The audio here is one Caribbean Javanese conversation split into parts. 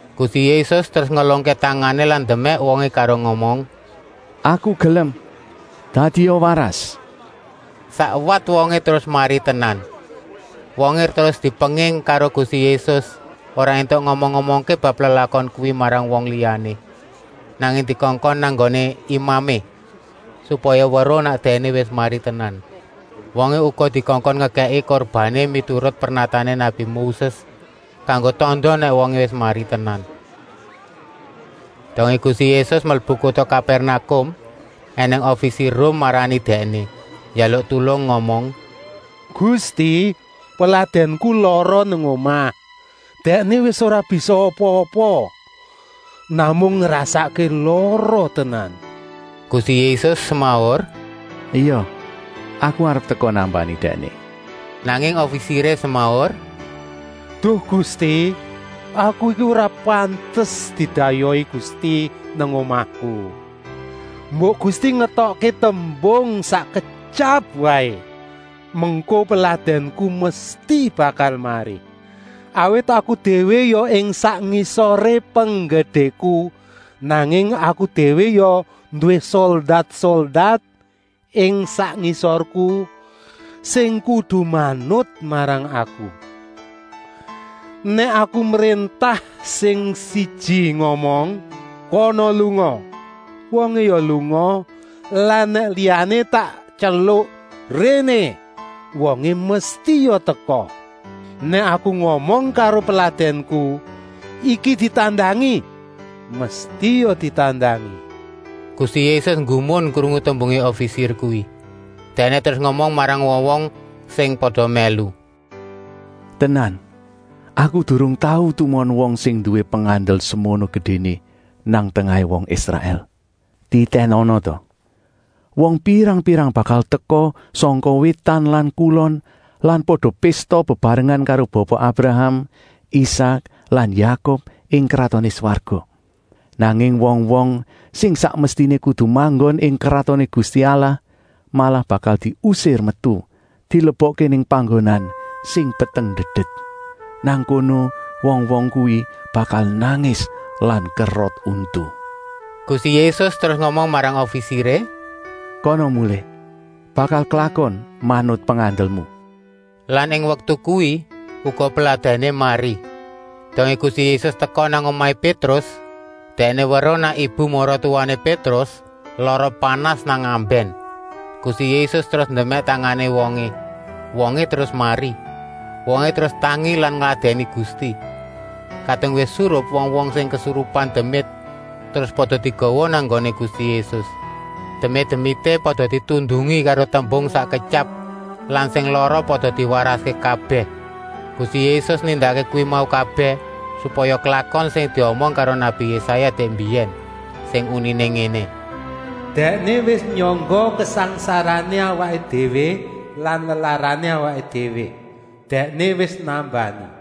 Gusti Yésus terus ngelungké tangané lan ndemèk wongé karo ngomong: “Aku gelem, dadia waras!” Sakwat wongé terus mari tenan. Wongé terus dipenging karo Gusti Yésus, ora éntuk ngomong-omongké bab lelakon kuwi marang wong liyané, nanging dikongkon nang nggoné imamé, supaya weruh nèk dèkné wis mari tenan. Wongé uga dikongkon ngekèki kurbané miturut pernatané nabi Moses kanggo tanda nèk wongé wis mari tenan. Dongé Gusti Yésus mlebu kuta Kapèrnakum ènèng ofisir Rum marani Dèkné, njaluk tulung ngomong: “Gusti, peladènku lara nang omah. Dèkné wis ora bisa apa-apa, namung ngrasakké lara tenan.” Gusti Yésus semaur: “Ya, Aku arep teka nambani dèkné.” Nanging ofisiré semaur: “Duh Gusti, aku iki ora pantes didayohi Gusti nang omahku. Mbok Gusti ngetokké tembung sak ketyap waé, mengko peladènku mesti bakal mari. Awit aku déwé ya ing sak ngisoré penggedéku, nanging aku déwé ya nduwé soldat-soldat ing sak ngisorku, sing kudu manut marang aku. Nèk aku mréntah sing siji ngomong: ‘Kana lunga,’ wongé ya lunga lan nèk liyané tak tyeluk: ‘Réné,’ wongé mesti ya teka. Nèk aku ngomong karo peladènku: ‘Iki ditandangi,’ mesti ya ditandangi.” Gusti Yésus nggumun krungu tembungé ofisir kuwi. Dèkné terus ngomong marang wong-wong sing pada mèlu: “Tenan, Aku durung tau tumon wong sing nduwé pengandel semono gedéné nang tengahé wong Israèl. Titènana ta, wong pirang-pirang bakal teka sangka wétan lan kulon lan pada pésta bebarengan karo Bapa Abraham, Isak lan Yakub ing Kratoné Swarga. Nanging wong-wong sing sak mestiné kudu manggon ing Kratoné Gusti Allah malah bakal diusir metu, dilebokké nang panggonan sing peteng-ndedet. Nang kono wong-wong kuwi bakal nangis lan kerot untu.” Gusti Yésus terus ngomong marang ofisiré: “Kana mulih, bakal klakon manut pengandelmu.” Lan ing waktu kuwi uga peladèné mari. Dongé Gusti Yésus teka nang omahé Pétrus, Dèkné weruh nèk ibu-maratuwané Pétrus lara panas nang ambèn. Gusti Yésus terus ndemèk tangané wongé, wongé terus mari. Wongé terus tangi lan ngladèni Gusti. Kadung wis surup wong-wong sing kesurupan demit terus pada digawa nang nggoné Gusti Yésus. Demit-demité pada ditundungi karo tembung sak ketyap lan sing lara pada diwaraské kabèh. Gusti Yésus nindakké kuwi mau kabèh, supaya klakon sing diomong karo nabi Yésaya dèk mbiyèn, sing uniné ngéné: “Dèkné wis nyangga kasangsarané awaké déwé lan lelarané awaké déwé Dèkné wis nambani.”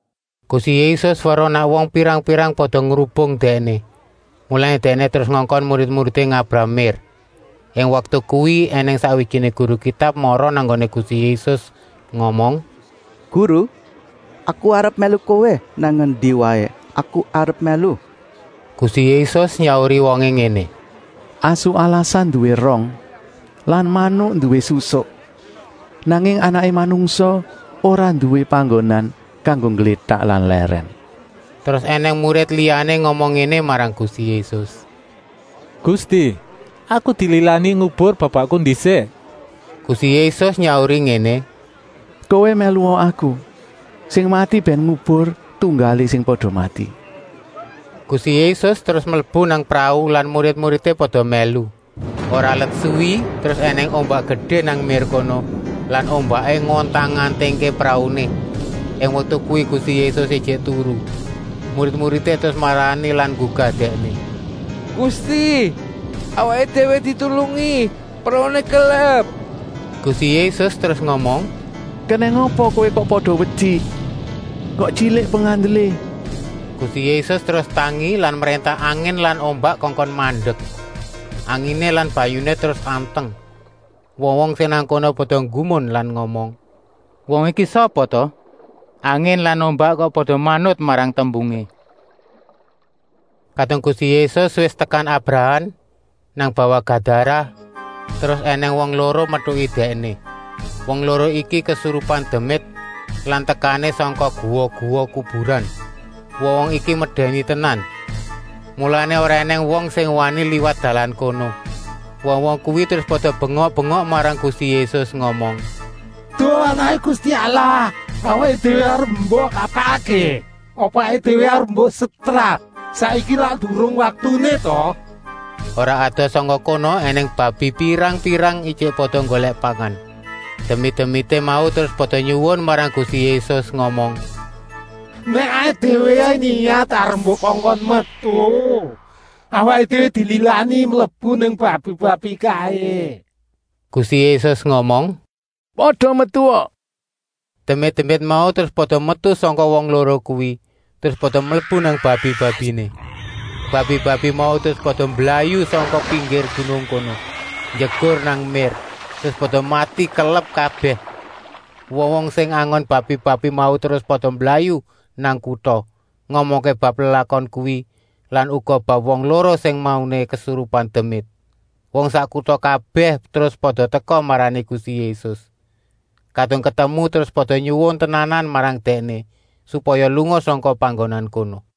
Gusti Yésus weruh nèk wong pirang-pirang pada ngrubung Dèkné, mulané Dèkné terus ngongkon murid-muridé ngabrah mér. Ing waktu kuwi ènèng sakwijiné guru Kitab mara nang nggoné Gusti Yésus ngomong: “Guru, aku arep mèlu Kowé, nang endi waé aku arep mèlu.” Gusti Yésus nyauri wongé ngéné: “Asu alasan nduwé rong lan manuk nduwé susuk, nanging Anaké Manungsa ora nduwé panggonan kanggo ngglétak lan lèrèn.” Terus ènèng murid liyané ngomong ngéné marang Gusti Yésus: “Gusti, aku dililani ngubur bapakku ndisik.” Gusti Yésus nyauri ngéné: “Kowé mèlua Aku, sing mati bèn ngubur tunggalé sing pada mati.” Gusti Yésus terus mlebu nang prau lan murid-muridé pada mèlu. Ora let suwi terus ènèng ombak gedé nang mér kono lan ombaké ngontang-antingké prauné. Ing waktu kuwi Gusti Yésus ijik turu. Murid-muridé terus marani lan nggugah Dèkné: “Gusti, awaké déwé ditulungi. Prauné kelep.” Gusti Yésus terus ngomong: “Kenèng apa kowé kok pada wedi? Kok tyilik pengandelé!” Gusti Yésus terus tangi lan mréntah angin lan ombak kongkon mandek. Anginé lan banyuné terus anteng. Wong-wong sing nang kono pada nggumun lan ngomong: “Wong iki sapa ta? Angin lan ombak kok pada manut marang tembungé?” Kadung Gusti Yésus wis tekan abrahan, nang bawah Gadarah, terus ènèng wong loro metuki Dèkné. Wong loro iki kesurupan demit lan tekané sangka guwa-guwa kuburan. Wong-wong iki medèni tenan, mulané ora ènèng wong sing wani liwat dalan kono. Wong-wong kuwi terus pada bengok-bengok marang Gusti Yésus, ngomong: “Duh Anaké Gusti Allah, awaké déwé arep mbok kapakké? Apa awaké déwé arep mbok setrap? Saiki lak durung waktuné ta?” Ora adoh sangka kono ènèng babi pirang-pirang ijik pada nggolèk pangan. Demit-demité mau terus pada nyuwun marang Gusti Yésus, ngomong: “Nèk awaké déwé niyat arep mbok kongkon metu, awaké déwé dililani mlebu nang babi-babi kaé!” Gusti Yésus ngomong: “Kana pada metua!” Demit-demit mau terus pada metu sangka wong loro kuwi, terus pada mlebu nang babi-babiné. Babi-babi mau terus pada mblayu sangka pinggir gunung kono, njegur nang mér terus pada mati kelep kabèh. Wong-wong sing angon babi-babi mau terus pada mblayu nang kuta, ngomongké bab lelakon kuwi lan uga bab wong loro sing mauné kesurupan demit. Wong sak kuta kabèh terus pada teka marani Gusti Yésus. Kadung ketemu terus pada nyuwun tenanan marang Dèkné, supaya lunga sangka panggonan kono.